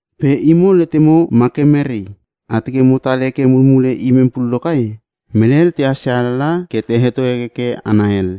Pe imo letemo ma ke merei? A teke mo tal heke mulmule imem pullo kai? Mele hel tehas ia alalaha ke te heto hekeke hana hel.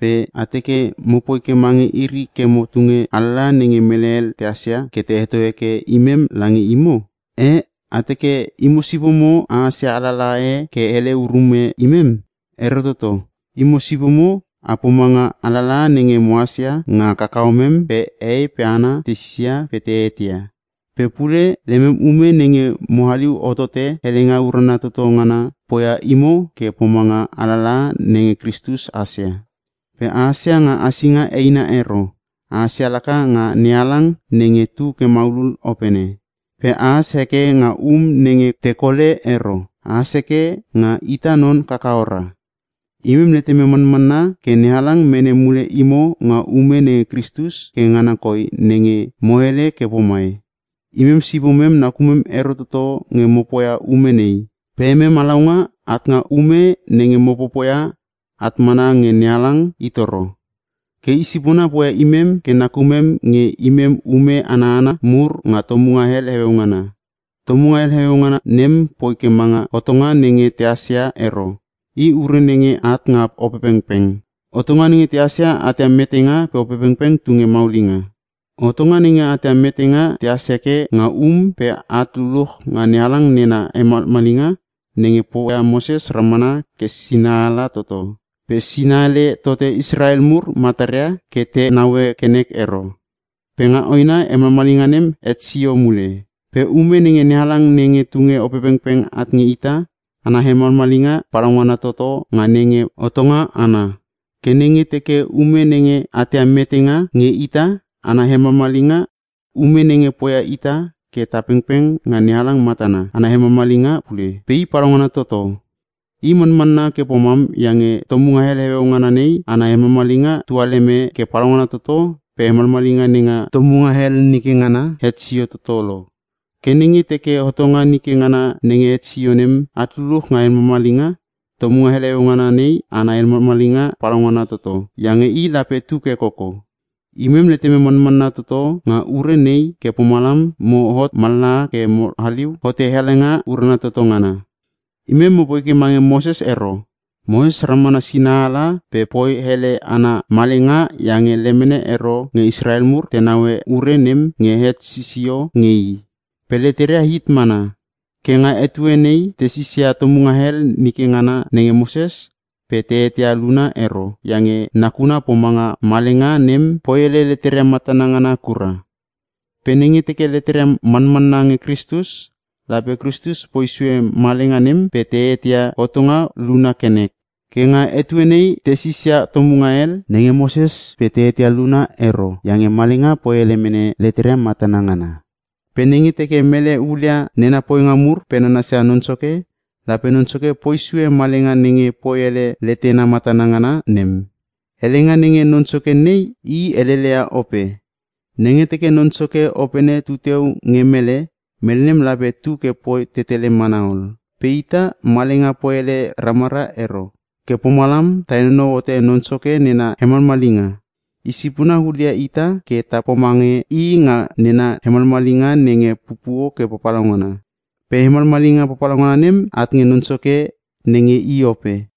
Pe a teke mopoi ke mange iri ke mo tunge alalaha nenge mele hel tehas ia, ke te heto heke imem lange imo? Eh! A teke imo sipomo a hasia alalaha e ke hele urume imem? Ero toto. Imo sipomo a pomanga alalaha nenge mohas ia nga kakahomem pe hehei pe hana te sisia pe te eteia. Pe pule lemem ume nenge mo haliu hotote helenga urana toto ngana poia imo ke a pomanga alalaha nenge Kristus hasia. Pe hasia nga hasinga eina ero, hasia laka nga NeHalang nenge tu ke maulul Opene. Pe has heke nga um nenge tekole ero, has heke nga ita non kakahora. Imem letemem manmanna ke NeHalang mene mule imo nga ume nenge Kristus ke ngana koi nenge mo hele ke pomai. Imem sipomem nakumem ero toto nge mo poia ume nei, pe emem halaunga nga ume nenge mo popoia at mana nge NeHalang i toro. Ke i sipona poia imem ke nakumem nge imem ume ana hana mur nga tomunga hel heueu ngana. Tomunga hel heueu ngana nem poi ke manga hotonga nenge tehas ia ero, i ure nenge at nga Opepengpeng. Hotonga nenge tehas ia atia metenga pe Opepengpeng tunge maulinga. Hotonga nenge atia metenga tehas heke nga um pe at luluch nga NeHalang nena hemalmalinga nenge poia Moses ramana ke sinaala toto. Pe sinaele tote Israel mur mataria ke te naue ke nek ero. Pe nga hoena hemalmalinga nem het sio mule. Pe ume nenge NeHalang nenge tunge Opepengpeng at nge ita, ana hemalmalinga palaungana toto nga nenge hotonga ana. Ke nenge teke ume nenge atia metenga nge ita ana hemalmalinga, ume nenge poia ita ke ta pengpeng nga NeHalang matana, ana hemalmalinga pule. Pe i palaungana toto. I manmanna ke pomam iange tomunga hel heueu ngana nei ana hemalmalinga tualeme ke palaungana toto pe hemalmalinga nenga tomunga hel nike ngana het sio toto lo. Ke nenge teke hotonga nike ngana nenge het sio nem at luluch nga hemalmalinga, tomunga hel heueu ngana nei ana hemalmalinga palaungana toto, iange i lape tu ke koko. Imem letemem manmanna toto nga ure nei ke pomalam moi hot mallaha ke mo haliu hote helenga urana toto ngana. Imem mo poi ke mange Moses ero. Moses ramana sinaala pe poi hele ana malenga iange lemene ero nge Israel mur te naue ure nem nge het sisio nge i. Pe leteria hit mana. Ke nga etue nei te sisia tomunga hel nike ngana nenge Moses pe te eteia luna ero, iange nakuna pomanga malenga nem poi ele leteria matana ngana kura. Pe nenge teke leteria manmanna nge Kristus, lape Kristus poi sue malenga nem pe te eteia hotonga luna ke nek. Ke nga etue nei tesis ia tomunga hel nenge Moses pe te eteia luna ero iange malenga poi ele mene leteria matana ngana. Pe nenge teke mele hulia nena poinga mur pe nanasia Non Soke, lape Non Soke poi sue malenga nenge poi ele letena matana ngana nem. Helenga nenge “Non Soke” nei, i heleleia Ope. Nenge teke Non Soke Opene tuteu nge mele, mele nem lape tu ke poi tetele mana ol. Pe ita, malenga poi ele ramara ero. Ke pomalam ta henonou hote Non Soke nena hemalmalinga. Isipona hulia ita ke ta pomange i nga nena hemalmalinga nenge pupuo ke papalaungana. Pe hemalmalinga palaungana nem, at nge Non Soke nenge i Ope.